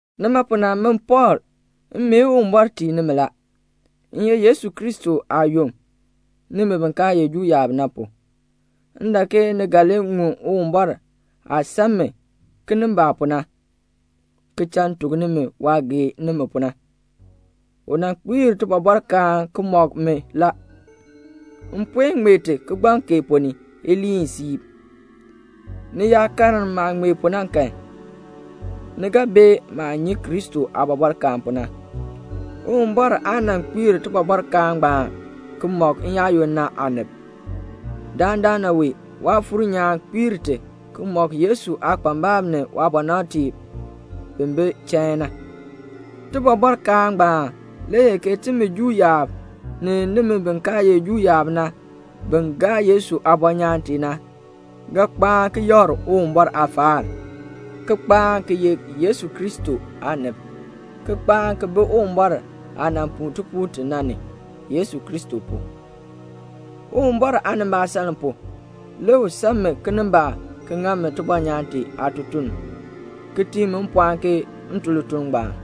Nima pu na, min Pɔɔl, m mee Uwumbɔr tii nimi la. M ye Yesu Kristo aayom, nimi bi kaa ye Juu yaab na pu. M dak ke ni ga li ŋun Uwumbɔr aah san mi kinimbaak pu na, ki cha m tuk nimi waah gee nimi pu na. U nan kpiir tibɔbɔrkaan ki mɔk mi la. M puen ŋmee ti kigbaŋ kee ponn ni iliin siib. Ni yaa karn maah ŋmee pu na kan, ni ga bee maah nyi Kristo aabɔbɔrkaan pu na. Uwumbɔr aa nan kpiir tibɔbɔrkaan ngbaan ki mɔk n-yaayoonn na aanib. Dandana wee Waafuur nyaan kpiir ti, ki mɔk Yesu aakpambalb ni waabɔnabtiib bi bi chain na. Tibɔbɔrkaan ngbaan le ye ke timi Juu yaab ni nimi bi kaa ye Juu yaab na bin gaa Yesu aabɔnyaan tee na, ga kpaan ki yakr Uwumbɔr aafaal, ki kpaan ki ye Yesu Kristo aanib, ki kpaan ki bi Uwumbɔr aah nan puu tipuul ti na ni, Yesu Kristo pu. Uwumbɔr aanimbaasaln pu, le u san mi kinimbaak ki ŋa mi tibɔnyaan tee aatutuln, ki tii mi mpɔɔn ke m tun lituln ngbaan.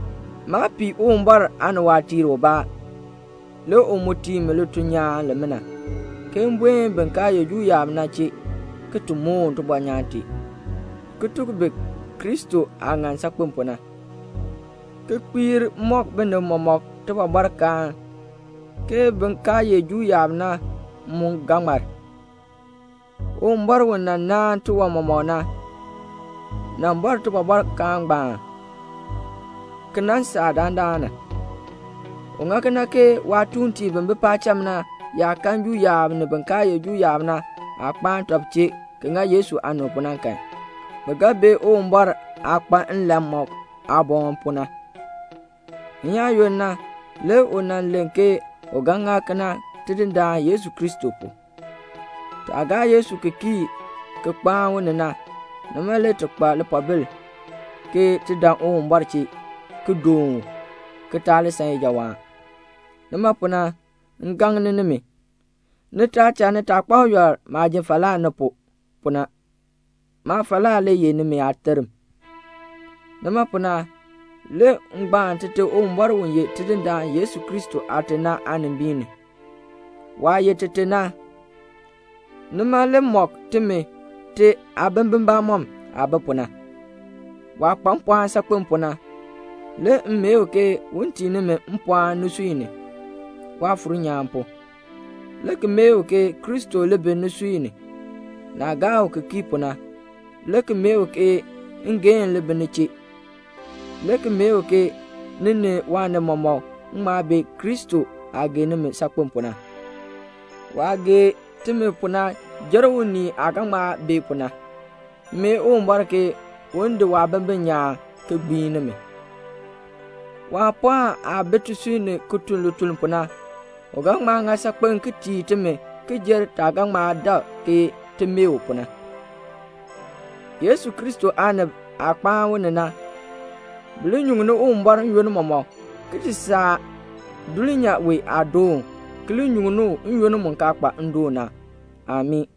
Maa pii Uwumbɔr aaniwaatiir ubaa, le u mu tii mi lituln nyaan limina, ke m buen bin kaa ye Juu yaab na chee, ki ti moon tibɔnyaan tee, ki tuk bi Kristo aah ŋan saakpen pu na, ki kpiir mɔk binib mɔmɔk tibɔbɔrkaan, ke bin kaa ye Juu yaab na mu ga ŋmar. Uwumbɔr u nan naan tiwan mɔmɔk na, nan bɔr tibɔbɔrkaan ngbaan ki nan saa dandana. U ŋa kena ke waatuuntiib bi bi paacham na yaa kan Juu yaab ni bin kaa ye Juu yaab na aah kpaan tɔb chee ki ŋa Yesu aanib pu na kan, bi ga bee Uwumbɔr aah kpa nlan mɔk aaboŋ pu na. N-yaayoonn na le u nan len ke u ga ŋa kena Tidindaan Yesu Kristo pu. Taah gaa Yesu ki kii ki kpaan u ni na, nima le ti kpa lipoobil ke ti dan Uwumbɔr chee ki doon u, ki taa li san ijawaan. Nima pu na m gaŋ nimi, ni taa cha nitaakpab yɔl maah ji falaa ni pu, pu na. Maafalaa le ye nimi aaterm. Nima pu na, le m gbaan Tite Uwumbɔr u ye Tidindaan Yesu Kristo Aate na aanimbiin ni. Waah ye Tite na, nima le mɔk timi te aabimbin bamɔnn aah bi pu na. Waah kpa mpɔɔn saakpen pu na, le m mee u ke un tii nimi mpɔɔn nisui ni, Waafuur nyaan pu, le ki mee u ke Kristo li bi nisui ni, naah gaa u ki kii pu na, le ki mee u ke ngeehn li bi ni chee, le ki mee u ke ni ni waanib mɔmɔk ŋma bee Kristo aah gee nimi saakpen pu na. Waah gee timi pu na jer unii aah ga ŋma bee pu na. M mee Uwumbɔr ke un di waabimbin nyaan ki gbiin nimi. Waapɔɔn aah bi tisui ni ki tun lituln pu na, u ga ŋma ŋa saakpen ki tii timi ki jer taah ga ŋma dak ke ti mee u pu na. Yesu Kristo aanib aah kpaan u ni na, bi li nyuŋni Uwumbɔr n-yoonn mɔmɔk ki ti saa dulnyaa wee aadoon, ki li nyuŋni u n-yoonn mu kaa kpa ndoon na. Amii.